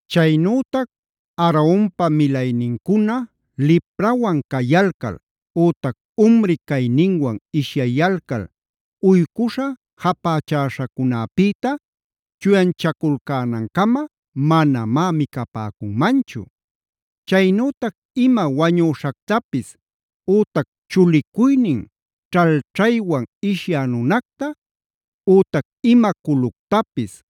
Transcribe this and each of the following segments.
“Chaynütac Aaronpa milaynincuna liprawan cayalcal ütac umri cayninwan ishyayalcal uycuśha japächäśhacunäpïta chuyanchaculcänancama manamá micapäcunmanchu. “Chaynütac ima wañüśhactapis ütac chulicuynin ćhalćhaywan ishyä nunacta, ütac ima culuctapis,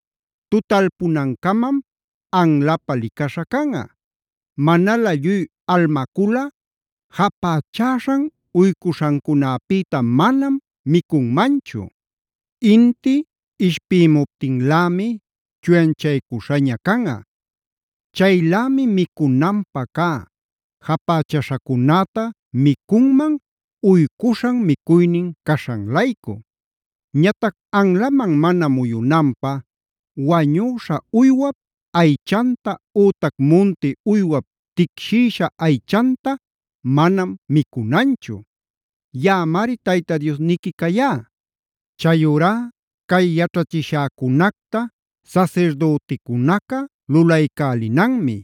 tutalpunancamam anlapä licaśha canꞌa. Manalä lluy almaculꞌa japächäśhan uycuśhancunapïta manam micunmanchu. Inti ishpïmuptinlämi chuyanchaycuśhaña canꞌa. Chaylämi micunanpä cä japächaśhacunäta micunman, uycuśhan micuynin caśhan-laycu. Ñatac anlaman mana muyunanpä wañüśha uywap aychanta ütac munti uywap ticshïsha aychanta manam micunanchu. Yaꞌamari Tayta Diosniqui cayá. “Chayurá cay yaćhachishäcunacta sasirdüticunaca lulaycälinanmi.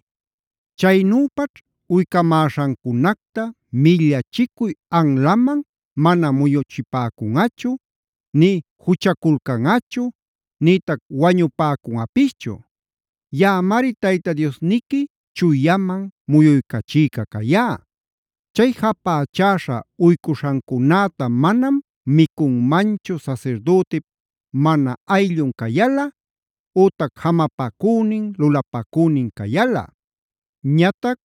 Chaynüpaćh uycamäśhancunacta millachicuy anlaman mana muyuchipäcunꞌachu, nï juchaculcanꞌachu, nïtac wañupäcunꞌapischu. Yaꞌamari Tayta Diosniqui chuyaman muyuycachïca cayá. “Chay japächäśha uycuśhancunäta manam micunmanchu sasirdütip mana ayllun cayalꞌa ütac jamapacünin, lulapacünin cayalꞌa. “Ñatac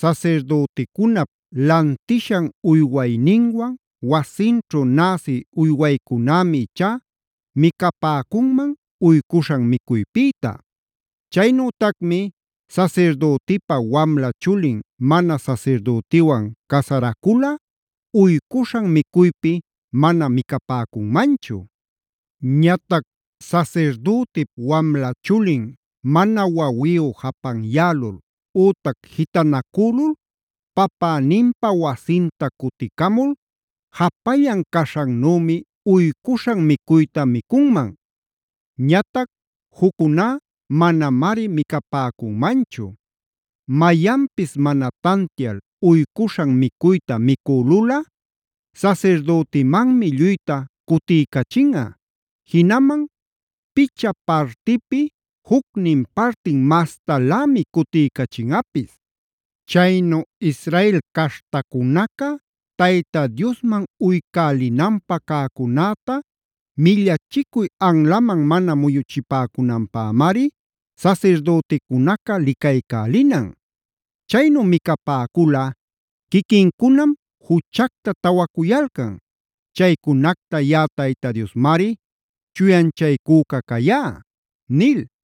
sasirdüticunap lantishan uywayninwan, wasinćhu näsi uywaycunämi ichá micapäcunman uycuśhan micuypïta. “Chaynütacmi sasirdütipa wamla chulin mana sasirdütiwan casaraculꞌa uycuśhan micuypi mana micapäcunmanchu. Ñatac sasirdütip wamla chulin mana wawiyu japanyälul ütac jitanacülul papäninpa wasinta cuticamul japallan caśhannümi uycuśhan micuyta micunman. Ñatac juccuná manamari micapäcunmanchu. “Mayanpis mana tantial uycuśhan micuyta micülulꞌa sasirdütimanmi lluyta cutiycachinꞌa, jinaman picha partipi jucnin partin mastalämi cutiycachinꞌapis. Chaynu Israel caśhtacunaca Tayta Diosman uycälinanpä cäcunäta millachicuy anlaman mana muyuchipäcunanpämari sasirdüticunaca licaycälinan. Chaynu micapäculꞌa quiquincunam juchacta tawacuyalcan. Chaycunacta yaꞌa Tayta Diosmari chuyanchaycüca cayá” nil.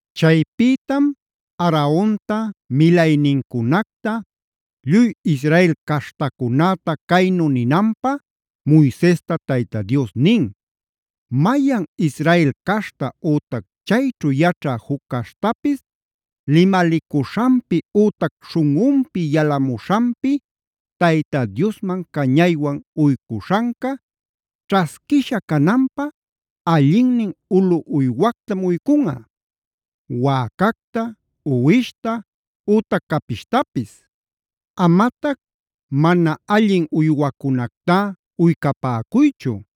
Chaypïtam Aaronta, milaynincunacta lluy Israel caśhtacunäta caynu ninanpä Moisesta Tayta Dios nin: “Mayan Israel caśhta ütac chayćhu yaćha juc caśhtapis limalicuśhanpi ütac śhunꞌunpi yalamuśhanpi Tayta Diosman cañaywan uycuśhanca, ćhasquisha cananpä allinnin ulu uywactam uycunꞌa: wäcacta, uwishta ütac capishtapis. Amatac mana allin uywacunactá uycapäcuychu;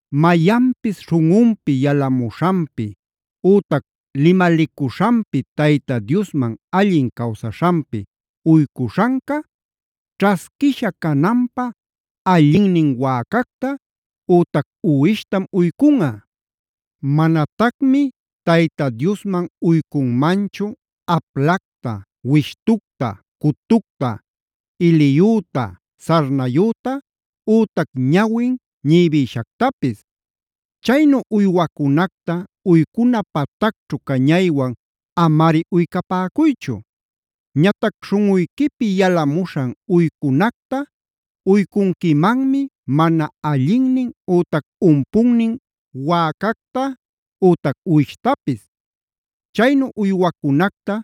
“Mayanpis śhunꞌunpi yalamuśhanpi ütac limalicuśhanpi Tayta Diosman allin cawsaśhanpi uycuśhanca ćhasquisha cananpä allinnin wäcacta ütac uwishtam uycunꞌa. Manatacmi Tayta Diosman uycunmanchu: aplacta, wishtucta, cutucta, iliyüta, sarnayüta ütac ñawin ñibïshactapis. Chaynu uywacunacta uycuna patacćhu cañaywan amari uycapäcuychu. Ñatac śhunꞌuyquipi yalamuśhan uycunacta uycunquimanmi mana allinnin ütac umpunnin wäcacta ütac uwishtapis. Chaynu uywacunacta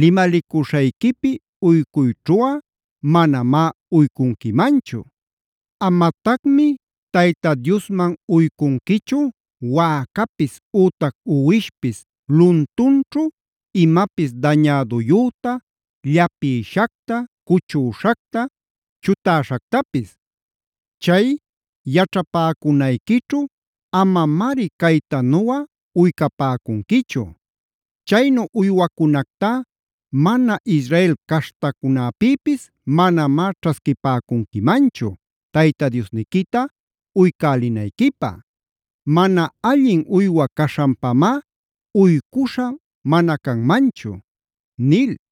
limalicuśhayquipi uycuyćhuꞌa manamá uycunquimanchu. Amatacmi Tayta Diosman uycunquichu wäcapis ütac uwishpis luntunćhu imapis dañäduyüta, llapïshacta, cuchüśhacta, chutäśhactapis. Chay yaćhapäcunayquićhu amamari caytanuꞌa uycapäcunquichu. Chaynu uywacunactá mana Israel caśhtacunapïpis manamá ćhasquipäcunquimanchu Tayta Diosniquita uycälinayquipä. Mana allin uywa caśhanpamá uycuśha mana canmanchu” nil.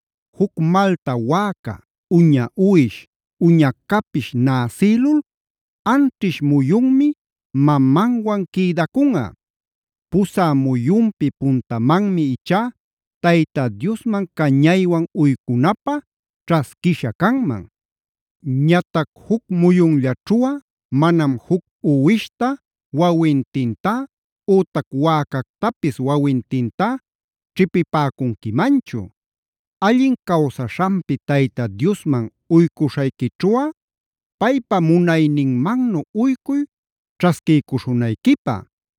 “Juc malta wäca, uña uwish, uña capish näsïlul anćhish muyunmi mamanwan quïdacunꞌa. Pusä muyunpi puntamanmi ichá Tayta Diosman cañaywan uycunapä ćhasquisha canman. “Ñatac juc muyunllaćhuꞌa manam juc uwishta wawintintá ütac wäcactapis wawintintá ćhipipäcunquimanchu. “Allin cawsaśhanpi Tayta Diosman uycuśhayquićhuꞌa paypa munayninmannu uycuy ćhasquiycuśhunayquipä.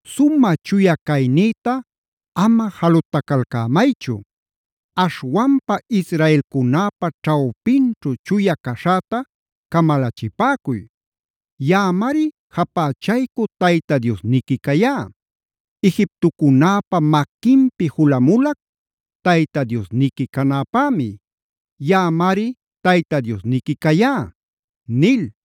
“Sumä chuya caynïta ama jalutacalcämaychu. Aśhwanpa israelcunäpa ćhawpinćhu chuya caśhäta camalachipäcuy. Yaꞌamari japächaycü Tayta Diosniqui cayá. Egiptocunäpa maquinpi julamulac Tayta Diosniqui canäpämi. Yaꞌamari Tayta Diosniqui cayá” nil.